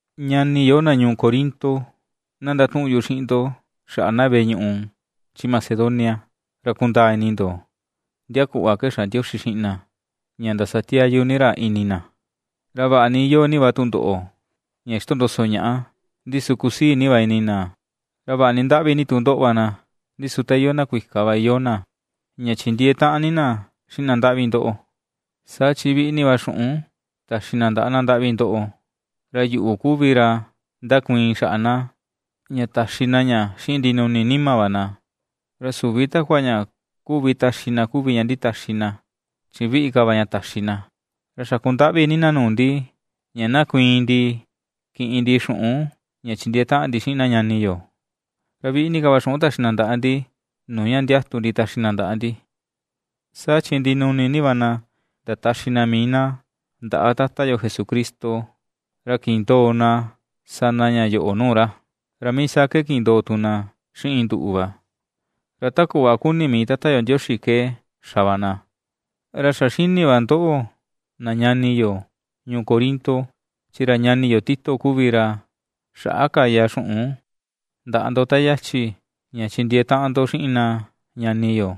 Ñani yo, na ñuu Corinto, na ndatuꞌun yu xiꞌin ndo xaꞌa na veꞌe ñuꞌu chi Macedonia ra kundaa ini ndo, ndia kuꞌva ke xa Ndioxi xiꞌin na ña ndasatiayu ni ra ini na. Ra vaꞌa ni iyoo ni va tundoꞌo ña xitondoso ñaꞌa, ndi su kusii ni va ini na; ra vaꞌa ni ndaꞌvi ni tu ndoꞌo va na, ndi su ta iyoo na kuika va iyoo na ña chindiee taꞌan na xiꞌin na ndaꞌvi ndoꞌo, saa chi viꞌi ni va xuꞌun taxi na ndaꞌa na ndaꞌvi ndoꞌo. Ra yuꞌu kuvi ra ^ndakuiin xaꞌa na, ña taxi na ña xiꞌin ndinuni nima va na, ra süvi takua ña ^kuvi taxi na kuvi ña nditaxi na, chi viꞌi ka va ña taxi na. Ra xaku ndaꞌvi ni na nuu ndi ña na kuiin ndi kiꞌin ndi xuꞌun ña chindiee taꞌan ndi xiꞌin na ñani yo. Ra viꞌi ni ka va xuꞌun taxi na ndaꞌa ndi nuu ña ndiatu ndi taxi na ndaꞌa ndi, saa chi ndinuni ni va na ndataxi na mii na ndaꞌa Tata yo Jesucristo, ra kindoo na ^sa na ña yoꞌo nuu ra, ra mii saa ke kindoo tu na xiꞌin nduꞌu va; ra ta kuꞌva ^kuni mii Tata yo Ndioxi ke xa va na. Ra xa ^xini va ndoꞌo, na ñani yo ñuu Corinto, chi ra ñani yo Tito kuvi ra xaꞌa kaya xuꞌun ndaꞌa ndo ta yachi ña chindiee taꞌan ndo xiꞌin na ñani yo,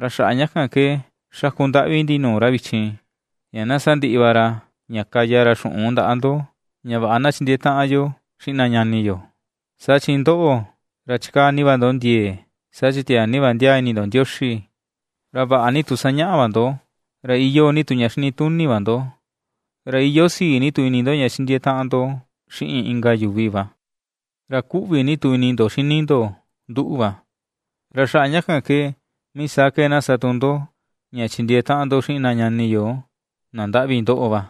ra xaꞌa ña kan ke ^xaku ndaꞌvi ndi nuu ra vichin ña na sandiꞌi va ra ña kaya ra xuꞌun ndaꞌa ndo, ña vaꞌa na chindiee taꞌan yo xiꞌin na ñani yo. Saa chi ndoꞌo, ra ^chikaa ni va ndo ndiee: saa chi tiaa ni va ndiaa ini ndo Ndioxi, ra vaꞌa ni tu sañaꞌa va ndo, ra iyoo ni tu ña xinituni va ndo, ra iyoo sii ni tu ini ndo ña chindiee taꞌan ndo xiꞌin inka yuvi va, ra kuꞌvi ni tu ini ndo xini ndo nduꞌu va; ra xaꞌa ña kan ke mii saa ke na ^sa tu ndo ña chindiee taꞌan ndo xiꞌin na ñani yo na ndaꞌvi ndoꞌo va.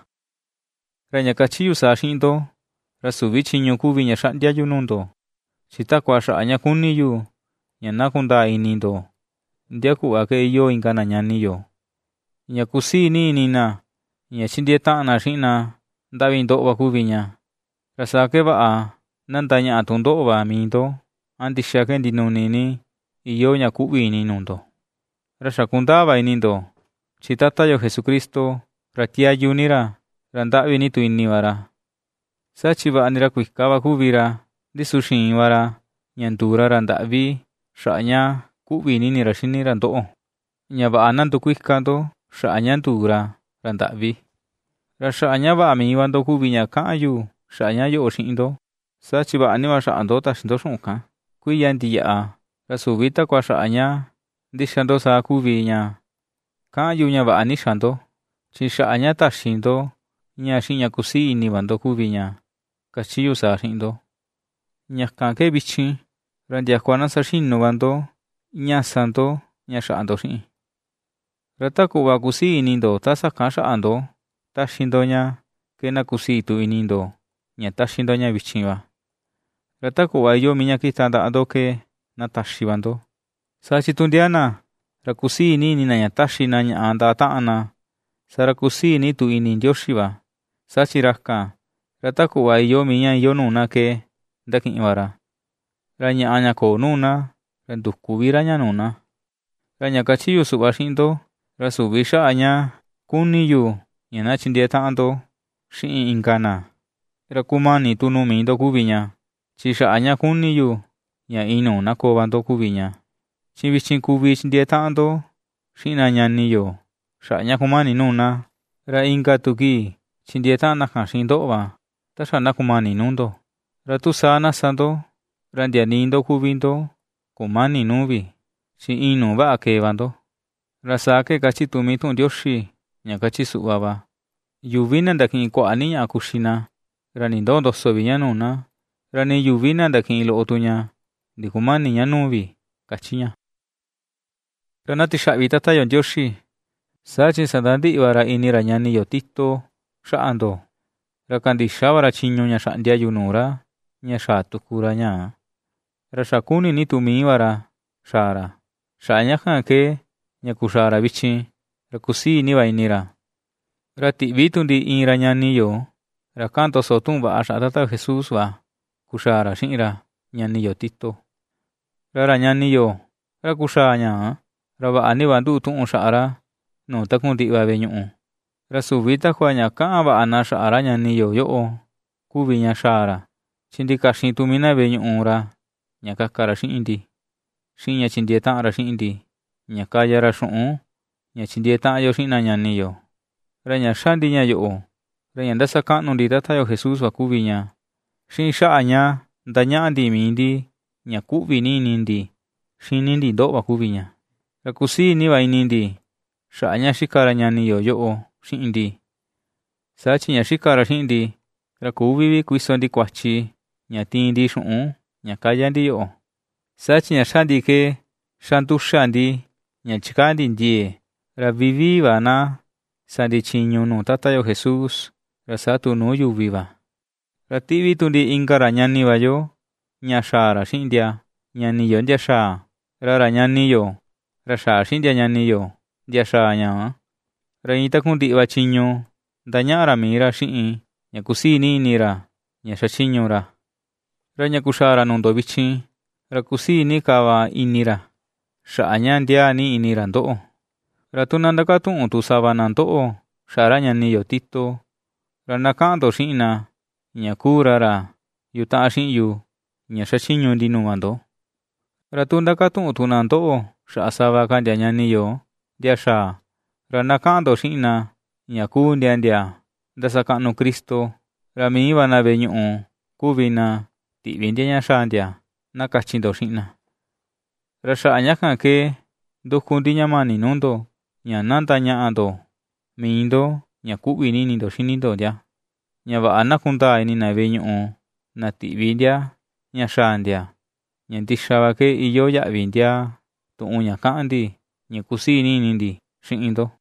Ra ña kachi yu saa xiꞌin ndo, ra süvi chiñu kuvi ña xaꞌndia yu nuu ndo, chi takua xaꞌa ña kuni yu ña na kundaa ini ndo, ndia kuꞌva ke iyoo inka na ñani yo, ña kusii ni ini na ña chindiee taꞌan na xiꞌin na ndaꞌvi ndoꞌo va kuvi ña, ra saa ke vaꞌa na ndañaꞌa tu ndoꞌo va mii ndo a ndixa ke ndinuni ni iyoo ña kuꞌvi ini nuu ndo. Ra xa kundaa va ini ndo chi Tata yo Jesucristo, ra tiayu ni ra, ra ndaꞌvi ni tu ini va ra. Saa chi vaꞌa ni ra kuika va kuvi ra, ndi su xiin va ra ña nduu ra ra ndaꞌvi xaꞌa ña ^kuꞌvi ni ini ra xini ra ndoꞌo, ña vaꞌa na ndukuika ndo xaꞌa ña nduu ra, ra ndaꞌvi. Ra xaꞌa ña vaꞌa mii va ndo kuvi ña kaꞌan yu xaꞌa ña yoꞌo xiꞌin ndo. Saa chi vaꞌa ni va xaꞌa ndo taxi ndo xuꞌun kan, kuiya ndiyaꞌa, ra süvi takua xaꞌa ña ndixa ndo saa kuvi ña kaꞌan yu ña vaꞌa ni xa ndo, chi xaꞌa ña taxi ndo ña xiꞌin ña kusii ni ini va ndo kuvi ña kachi yu saa xiꞌin ndo. Ña kan ke vichin, ra ndiakua na saxinu va ndo ña sa ndo ña xaꞌa ndo xiꞌin. Ra ta kuꞌva kusii ini ndo ta sakan xaꞌa ndo ^taxi ndo ña ke na kusii tu ini ndo ña taxi ndo ña vichin va, ra ta kuꞌva iyoo mii ña kita ndaꞌa ndo ke na taxi va ndo. Saa chi tu ndia na, ra ^kusii ni ini na ña taxi na ñaꞌa ndaꞌa taꞌan na, saa ra ^kusii ni tu ini Ndioxi va; saa chi ra kan, ra ta kuꞌva iyoo mii ña iyoo nuu na ke ndakiꞌin va ra; ra ñaꞌa ña köo nuu na, ra ndüku vi ra ña nuu na. Ra ña kachi yu suꞌva xiꞌin ndo, ra süvi xaꞌa ña kuni yu ña na chindiee taꞌan ndo xiꞌin inka na, ra kumani tu nuu mii ndo kuvi ña; chi xaꞌa ña kuni yu ña inuu na koo va ndo kuvi ña. Chi vichin kuvi chindiee taꞌan ndo xiꞌin na ñani yo xaꞌa ña kumani nuu na, ra inka tu kii, chindiee taꞌan na kan xiꞌin ndoꞌo va, ta xa na kumani nuu ndo. Ra tu saa na sa ndo, ra ndia nii ndo kuvi ndo kumäni nuu vi, chi inuu vaꞌa kee va ndo. Ra saa ke kachi tu mii tuꞌun Ndioxi, ña kachi suꞌva va: “Yuvi na ndakiꞌin kuaꞌa ni ñaꞌa kuxi na, ra nindöo ndoso vi ña nuu na, ra nii yuvi na ndakiꞌin loꞌo tu ña, ndikumäni ña nuu vi”, ^kachi ña. Ra na tixaꞌvi Tata yo Ndioxi, saa chi sandandiꞌi va ra ini ra ñani yo Tito xaꞌa ndo. Ra kandixa va ra chiñu ña xaꞌndia yu nuu ra ña xaa tuku ra ñaa, ra xa ^kuni ni tu mii va ra xaa ra, xaꞌa ña kan ke, ña kuxaa ra vichin, ra kusii ni va ini ra. Ra tiꞌvi tu ndi iin ra ñani yo, ra kaꞌan ndoso tuꞌun vaꞌa xaꞌa Tata yo Jesús va kuxaa ra xiꞌin ra ñani yo Tito, ra ra ñani yo, ra kuxaa ñaa, ra vaꞌa ni va nduꞌu tuꞌun xaꞌa ra nuu takundiꞌi va veꞌe ñuꞌu. Ra süvi takua ña kaꞌan va na xaꞌa ra ñani yo yoꞌo kuvi ña xaa ra, chi ndikaxin tu mii va na veꞌe ñuꞌu ra ña kaka ra xiꞌin ndi, xiꞌin ña chindiee taꞌan ra xiꞌin ndi ña kaya ra xuꞌun ña chindiee taꞌan yo xiꞌin na ñani yo. Ra ña ^xa ndi ña yoꞌo ra ña ndasakaꞌnu ndi Tata yo Jesús va kuvi ña, xiꞌin xaꞌa ña ndañaꞌa ndi mii ndi ña kuꞌvi ini ndi xini ndi ndoꞌo va kuvi ña. Ra kusii ni va ini ndi xaꞌa ña xika ra ñani yo yoꞌo xiꞌin ndi, saa chi ña xika ra xiꞌin ndi, ra küvi vi kuiso ndi kuachi ña tiin ndi xuꞌun ña kaya ndi yoꞌo. Saa chi ña ^xa ndi ke ^xa nduxa ndi ña chikaa ndi ndiee, ra vivii va na sa ndi chiñu nuu Tata yo Jesús, ra saa tu nuu yuvi va. Ra ^tíꞌví tu ndi inka ra ñani va yo ña xaa ra xiꞌin ndia ñani yo ndia xaa, ra ra ñani yo, ra xaa xiꞌin ndia ñani yo ndia xaa ñaa, ra iin takundiꞌi va chiñu ^ndañaꞌa ra mii ra xiꞌin ña kusii ni ini ra ña xachiñu ra, ra ña kuxaa ra nuu ndoꞌo vichin, ra kusii ni ka va ini ra, xaꞌa ña ndiaa ni ini ra ndoꞌo. Ra tu na ndakatuꞌun tu sava na ndoꞌo xaꞌa ra ñani yo Tito, ra na kaꞌan ndo xiꞌin na, ña kuu ra ra yutaꞌan xiꞌin yu ña xachiñu ndi nuu va ndo. Ra tu ndakatuꞌun tu na ndoꞌo xaꞌa sava ka ndia ñani yo ndia xaa, ra na kaꞌan ndo xiꞌin na ña kuu ndia ndia ndasakaꞌnu Cristo, ra mii va na veꞌe ñuꞌu kuvi na tiꞌvi ndia ña xaa ndia, na kachi ndo xiꞌin na. Ra xaꞌa ña kan ke nduku ndi ña mani nuu ndo, ña na ndañaꞌa ndo mii ndo ña kuꞌvi ni ini ndo xini ndo ndia, ña vaꞌa na kundaa ini na veꞌe ñuꞌu na tiꞌvi ndia ña xaa ndia, ña ndixa va ke iyoo yaꞌvi ndiaa tuꞌun ña kaꞌan ndi ña kusii ni ini ndi xiꞌin ndo.